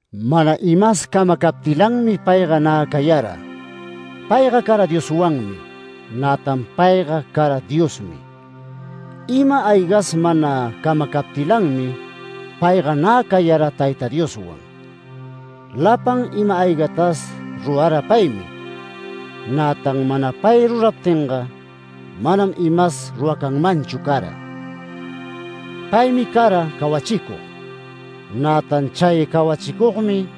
Mana imas camacaptilanmi payga nä cayara. Payga cara Dioswanmi. Nätan Payga cara Diosmi. Ima-aygas mana camacaptilanmi, payga nä cayara Tayta Dioswan. Lapan ima-aygatas rurara paymi. Nätan mana pay ruraptinga manam imas ruracanmanchu cara. Paymi cara cawachicug. Nätan chay cawachicugmi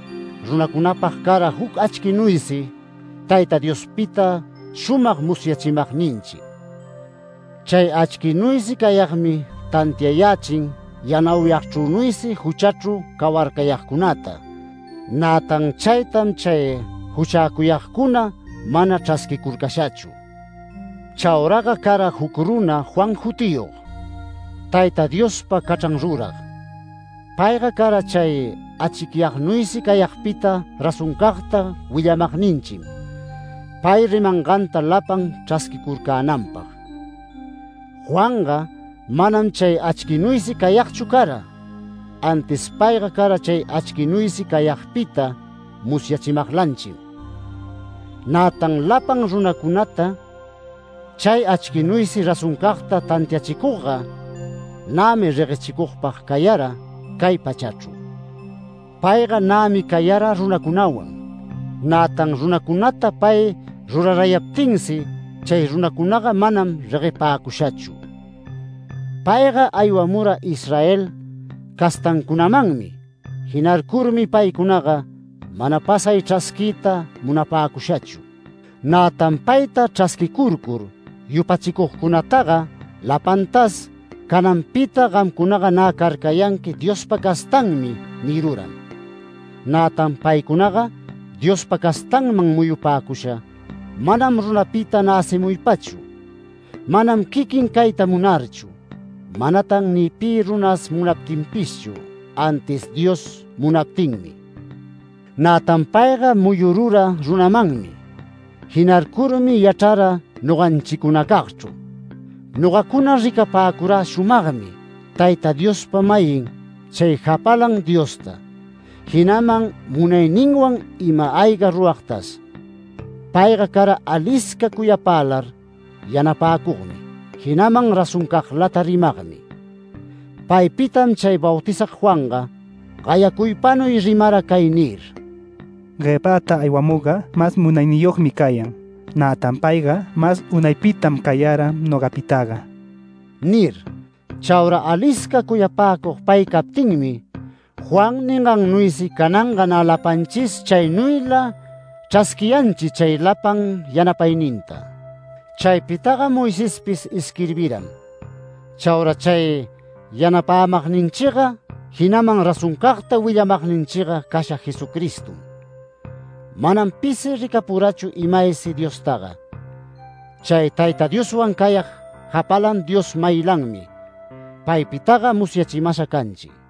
runacunapag cara juc achquinuysi Tayta Diospita shumag musyachimagninchi. Chay achquinuysi cayagmi tantiayächin yanauyagchrünuysi juchachru cawarcayagcunata, nätan chaytam chay juchäcuyagcuna mana chrasquicurcashachu. Chauraga cara juc runa Juan jutiyog, Tayta Diospa cachran rurag. Payga cara chay achicyagnuysi cayagpita razoncagta willamagninchim, pay rimanganta lapan chrasquicurcänanpag. Juanga manam chay achquinuysi cayagchu cara, antis payga cara chay achquinuysi cayagpita musyachimaglanchim. Nätan lapan runacunata chay achquinuysi razoncagta tantiachicugga nämi reguechicugpag cayara cay pachachru. Payga nämi cayara runacunawan, nätan runacunata pay rurarayaptinsi, chay runacunaga manam reguepäcushachu. Payga aywamura Israel castancunamanmi. Jinarcurmi paycunaga mana pasay chrasquiyta munapäcushachu. Nätan payta chrasquicurcur yupachicugcunataga lapantas “Cananpita gamcunaga nä carcayanqui Diospa castanmi” niruram. Nätan paycunaga Diospa castanman muyupäcusha manam runapita näcimuypachu, manam quiquin cayta munarchu. Manatan ni pi runas munaptinpishchu, antis Dios munaptinmi. Nätan payga muyurura runamanmi. Jinarcurmi yachrara noganchicunacagchru. Nogacuna ricapäcurä shumagmi Tayta Diospa-mayin chay japalan Diosta, jinaman munayninwan ima-ayga ruragtas. Payga cara alisca cuyapälar yanapäcugmi, jinaman razoncaglata rimagmi. Paypitam chay Bautizag Juanga gayacuypanuy rimara cay nir: “Guepäta aywamugga mas munayniyogmi cayan. Nätan payga mas unaypitam cayara nogapitaga” nir. Chaura alisca cuyapäcug pay captinmi, Juan ningannuysi cananga nä lapanchis chaynuyla chrasquiyanchi chay lapan yanapayninta. Chaypitaga Moisespis isquirbiram. Chaura chay yanapämagninchiga, jinaman razoncagta willamagninchiga casha Jesucristom. Manam pisi ricapurachu imaysi Diostaga. Chay Tayta Dioswan cayag japalan Dios-mayilanmi, paypitaga musyachimasha canchi.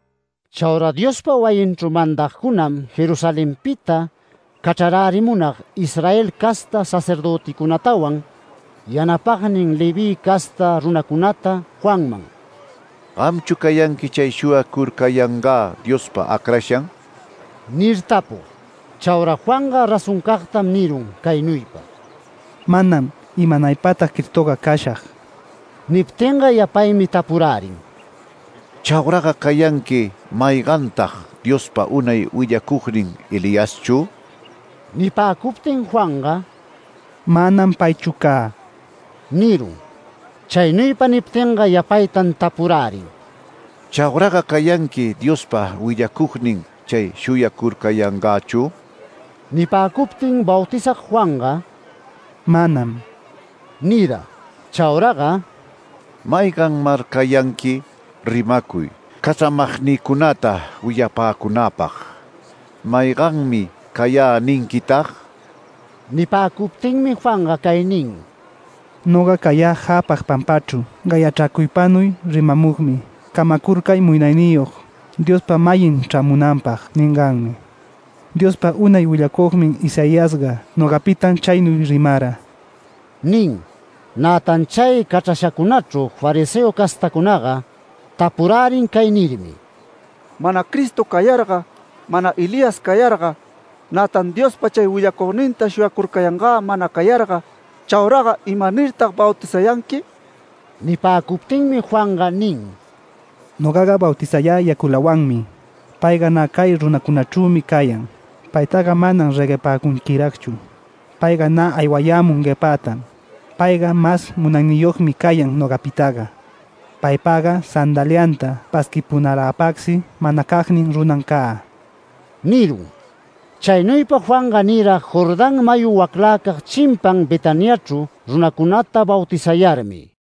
Chaura Diospa wayinchru mandagcunam Jerusalenpita cachrarärimunag Israel casta sacerdöticunatawan yanapagnin Leví casta runacunata Juanman “¿Gamchu cayanqui chay shuyacurcayangä Diospa acrashan?” nir tapug. Chaura Juanga razoncagtam nirun caynuypa: “Manam. Imanaypatag Cristoga cashag”. Niptinga yapaymi tapurärin: “¿Chauraga cayanqui maygantag Diospa unay willacugnin Eliaschu?” Nipäcuptin Juanga: “Manam paychu cä” nirun. Chaynuypa niptinga yapaytan tapurärin: “¿Chaura cayanqui Diospa willacugnin chay shuyacurcayangächu?” Nipäcuptin Bautizag Juanga “Manam” nira. Chauraga “¿Mayganmar cayanqui? Rimacuy, cachramagnïcunata willapäcunäpag. ¿‘Mayganmi cayä’ ninquitag?” Nipäcuptinmi Juanga cay nin: “Noga cayä jäpag pampachru gayachracuypanuy rimamugmi ‘Camacurcay Munayniyog Diospa-mayin chrämunanpag’ ninganmi, Diospa unay willacugnin Isaiasga nogapitam chaynuy rimara” nin. Nätan chay cachrashacunachru fariseo castacunaga tapurärin cay nirmi: “Mana Cristo cayarga, mana Elías cayarga, nätan Diospa chay willacugninta ‘Shuyacurcayangä’ mana cayarga, chauraga ¿imanirtag bautizayanqui?” Nipäcuptinmi Juanga nin: “Nogaga bautizayä yaculawanmi. Payga nä cay runacunachrümi cayan. Paytaga manam reguepäcunquiragchu. Payga nä aywayämun guepätam. Payga mas munayniyogmi cayan nogapitaga. Paypagga sandaliata pasquipunalapagsi manacagnin runam cä” nirun. Chaynuypa Juanga nira Jordán mayu wacläcag chimpan Betaniachru, runacunata bautizayarmi.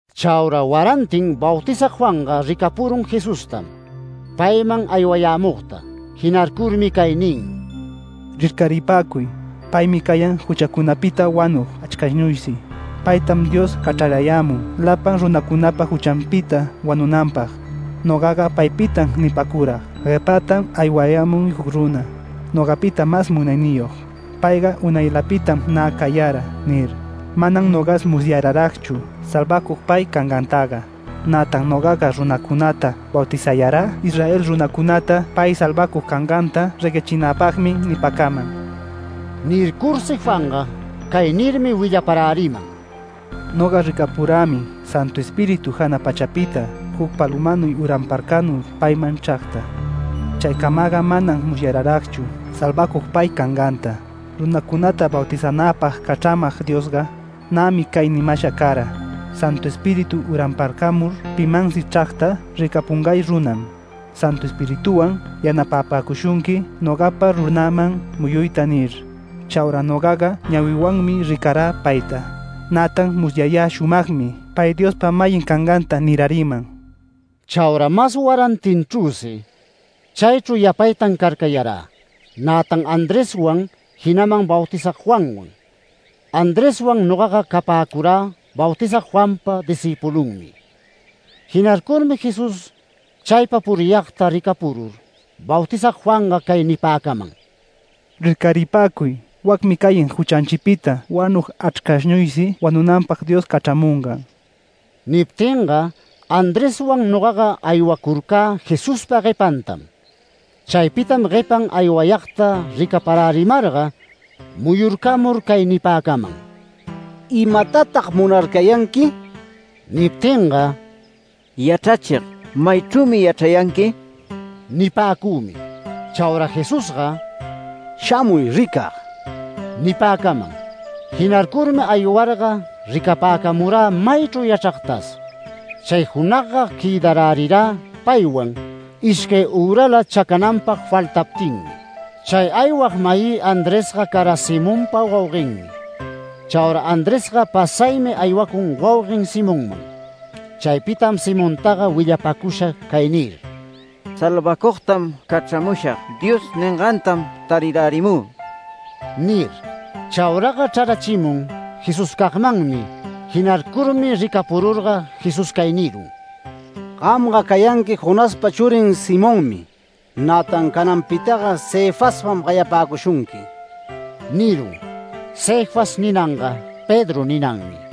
Chaura warantin Bautizag Juanga ricapurun Jesustam payman aywayämugta. Jinarcurmi cay nin: “Rircäripäcuy, paymi cayan juchacunapita wanug achrcashnuysi. Paytam Dios cachrarayämun lapan runacunapa juchanpita wanunanpag. Nogaga paypitam nipäcurag: Guepätam aywayämun juc runa, nogapita mas munayniyog. ‘Payga unaylapitam nä cayara’ nir. Manam nogas musyararagchu salvacug pay cangantaga. Nätan nogaga runacunata bautizayarä Israel runacunata pay salvacug canganta reguechinäpagmi nipäcaman”. Nircursi Juanga cay nirmi willaparäriman: “Noga ricapurämi Santu Espíritu jana pachapita juc palömanuy uranparcamur payman chragta. Chaycamaga manam musyararagchu salvacug pay canganta, runacunata bautizänäpag cachramag Diosga, nämi cay nimasha cara: ‘Santu Espíritu uranparcamur pimansi chragta ricapungay runam, Santu Espirituwan yanapapäcushunqui nogapa runäman muyuyta’ nir. Chaura nogaga ñawiwanmi ricarä payta, nätan musyayä shumagmi pay Diospa-mayin canganta niräriman”. Chaura mas warantinchrüsi chaychru yapaytan carcayarä, nätan Andreswan, jinaman Bautizag Juanwan. Andreswan nogaga capäcurä Bautizag Juanpa discïpulunmi. Jinarcurmi Jesús chaypa puriyagta ricapurur Bautizag Juanga cay nipäcaman: “Rircaripäcuy. Wacmi cayan juchanchipita wanug achrcashnuysi wanunanpag Dios cachramungan”. Niptinga Andreswan nogaga aywacurcä Jesuspa guepantam. Chaypitam guepan aywayagta ricaparärimarga muyurcamur cay nipäcaman: “¿Imatatag munarcayanqui?” Niptinga “Yachrachig, ¿maychrümi yachrayanqui?” nipäcümi. Chaura Jesusga “Shamuy ricag” nipäcaman. Jinarcurmi aywarga ricapäcamurä maychru yachragtas. Chay junagga quëdarärirä paywan, ishcay ürala chacananpag faltaptinmi. Chay aywag-mayï Andresga cara Simonpa wauguenmi. Chaura Andresga pasaymi aywacun wauguen Simonman. Chaypitam Simontaga willapacusha cay nir: “ ‘Salvacugtam cachramushag’ Dios ningantam tarirärimü” nir. Chauraga chrarachimun Jesuscagmanmi. Jinarcurmi ricapururga Jesús cay nirun: “Gamga cayanqui Jonaspa churin Simonmi. Nätan cananpitaga Cefaspam gayapäcushunqui” nirun. (‘Cefas’ ninanga ‘Pedro’ ninanmi.)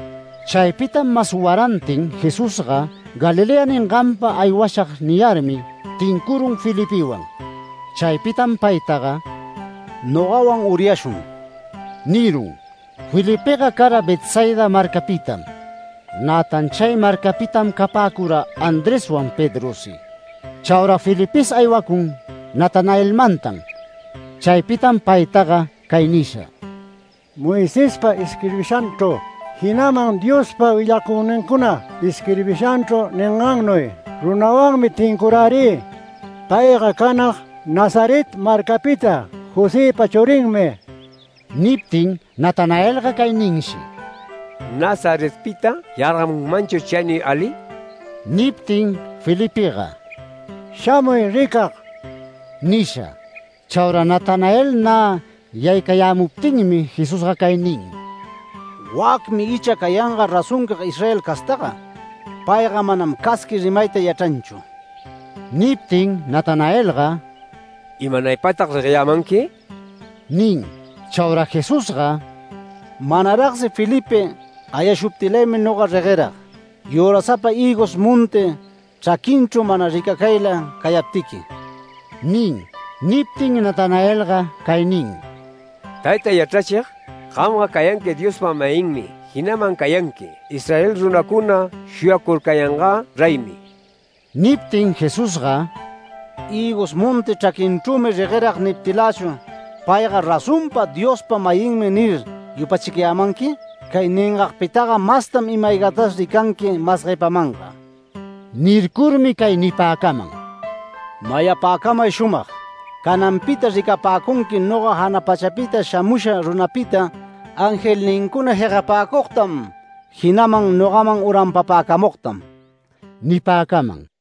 Chaypitam mas warantin Jesusga “Galilea ninganpa aywashag” niyarmi, tincurun Felipewan. Chaypitam paytaga “Nogawan uryashun” nirun. Felipega cara Betsaida marcapitam. Nätan chay marcapitam capäcura Andreswan Pedrosi. Chaura Felipes aywacun Natanaelmantan. Chaypitam paytaga cay nisha: “Moisespa isquirbishanchru, jinaman Diospa willacugnincuna isquirbishanchru ningannuy runawanmi tincurärï. Payga canag Nazaret marcapita Josëpa churinmi”. Niptin Natanaelga cay ninshi: “¡Nazaretpita yargamunmanchur chaynuy ali!” Niptin Felipega “Shamuy ricag” nisha. Chaura Natanael nä yaycayämuptinmi Jesusga cay nin: “Wacmi icha cayanga razoncag Israel castaga. Payga manam casqui rimayta yachranchu”. Niptin Natanaelga “¿Imanaypatag regueyämanqui?” nin. Chaura Jesusga “Manaragsi Felipe gayashuptilaymi noga reguerag, yürasapa hïgos monti chraquinchru mana ricacayla cayaptiqui” nin. Niptin Natanaelga cay nin: “Tayta yachrachig, gamga cayanqui Diospa-mayinmi, jinaman cayanqui Israel runacuna shuyacurcayangä reymi”. Niptin Jesusga “¿Hïgos monti chraquinchrümi reguerag niptilächu ‘Payga razonpa Diospa-mayinmi’ nir, yupachicayämanqui? Cay ningagpitaga mastam ima-aygatas ricanqui mas guepamanga”. Nircurmi cay nipäcaman: “Mayapäcamay shumag: Cananpita ricapäcunqui noga jana pachapita shamusha runapita, angelnincuna jegapäcugtam, jinaman nogaman uranpapäcamugtam” nipäcaman.